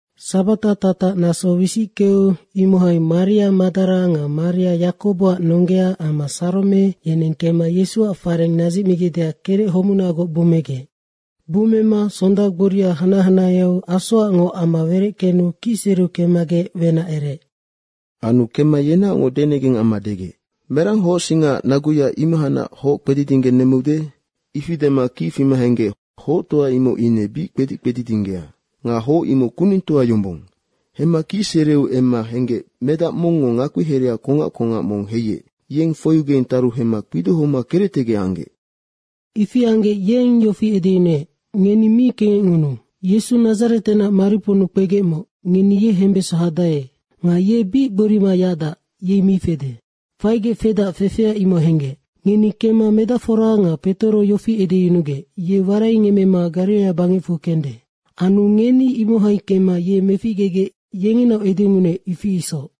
Sabata tatac naso wisickeu imohai Maria Madara nga Maria Yakoboac nonggea amma Sarome, yeneng kemma Yesuac fareng nadzicmigecdeac kerec homunagoc bummegec. Bummema sonda gboria hanac hanaheau asoacngoc ama wereckenu kicsereu kemmagec wenac ereec. Anu kemma yenaocngoc denegeng amma degec, “Merang hocsingaac naguya imohacnac hoc kpedidinggenemmeude?” Ifi dema kic fima henggec hoctoa imoc ine bic kpedic kpedidinggea. Nga hoc imoc kunengtoa yombong. Hemma kicsereu emma henggec medac mongngo ngakpihereha kongac kongac mong heiec, yeng foiugeng taru hemma kpidohoma kerectegec anggec. Ifi anggec yeng yofi edeyunuec, “Ngeni mi kengecngunuu. Yesu Nadzaretenac mariponnu kpegecmoc, ngeni ye hembeso hadae nga ye bic gborima yacdac, yei mi fede. Faigec fedac, fefea imoc henggec. Ngeni kemma medacfora nga Petoro yofi edeyunugec, ye waraingemmema Gariraia bangecfu kende. Anu ngeni imohai kemma ye meficgegec, yengenaoc edengunuec, ifi isoc.”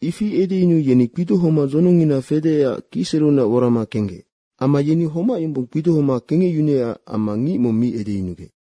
Ifi edeyunuu yeni kpidohoma dzonongngina fedeecac kicsereunac worama kenggec. Amma yeni homac yombong kpidohoma kengecyunuecac amma ngic mong mi edeyunugec.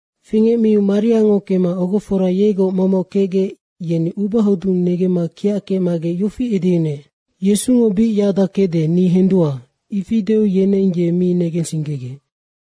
Fingecmiu Mariango kemma ogofora yegoc momoc kecgec, yeni ubahodung negemma kiac kecmagec yofi edeyunuec, “Yesungo bic yacdac kecde, ni hendua.” ifi deu yeneng ye mi negensinggegec.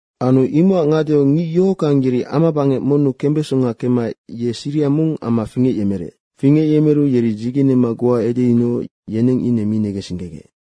Anu imocac ngadeau ngic yohockang yeri amabangec monnu kembesonga kemmaec ye siriha mong amma fingecyemerec. Fingecyemeru yeri dzigenema goa edeyunugec, yeneng ine mi negensinggegec.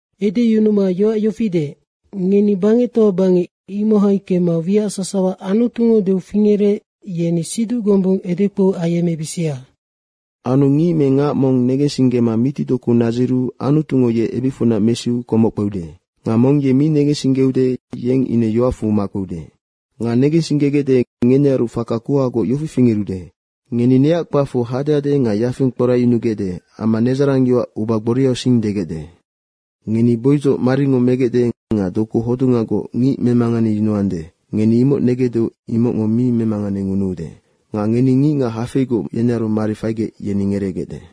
Edeyunuma yoac yofi deec, “Ngeni bangectoa bangec, imohai kemma wiac sasawa Anutungo deu fingerec, yeni siduc gombung edekpou ayemmebisia. Anu ngic me ngac mong negensinggema mitidoku nadziru Anutungo ye ebicfunac mesiu komoc kpeude. Nga mong ye mi negensinggeude, yeng ine yoacfu makpeude. Nga negensinggegecde, ngenearu faka kuhagoc yofi fingerude. Ngeni neac kpacfu hadehade nga yafing kporacyunugecde amma nedzarangyoac uba gboriausing degecde. Ngeni boidzoc maringo megecde nga doku hodungagoc ngic memanganeyunuande, ngeni imoc negecdeu, imocngo mi memanganengunuude. Nga ngeni ngicngac hafeigoc yenearu mari faigec, yeni ngereegecde.”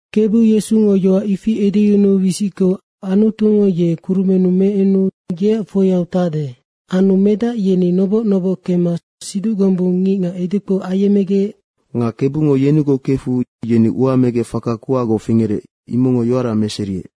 Kebu Yesungo yoac ifi edeyunuu wisickeu Anutungo ye kurumennu meenu yeac foiau tacde. Anu medac yeni noboc noboc kemma siduc gombung ngicngac edekpou ayemmegec. Nga Kebungo yenigoc kefu yeni ua megec faka kuhagoc fingerec, imocngo yoara meseriec.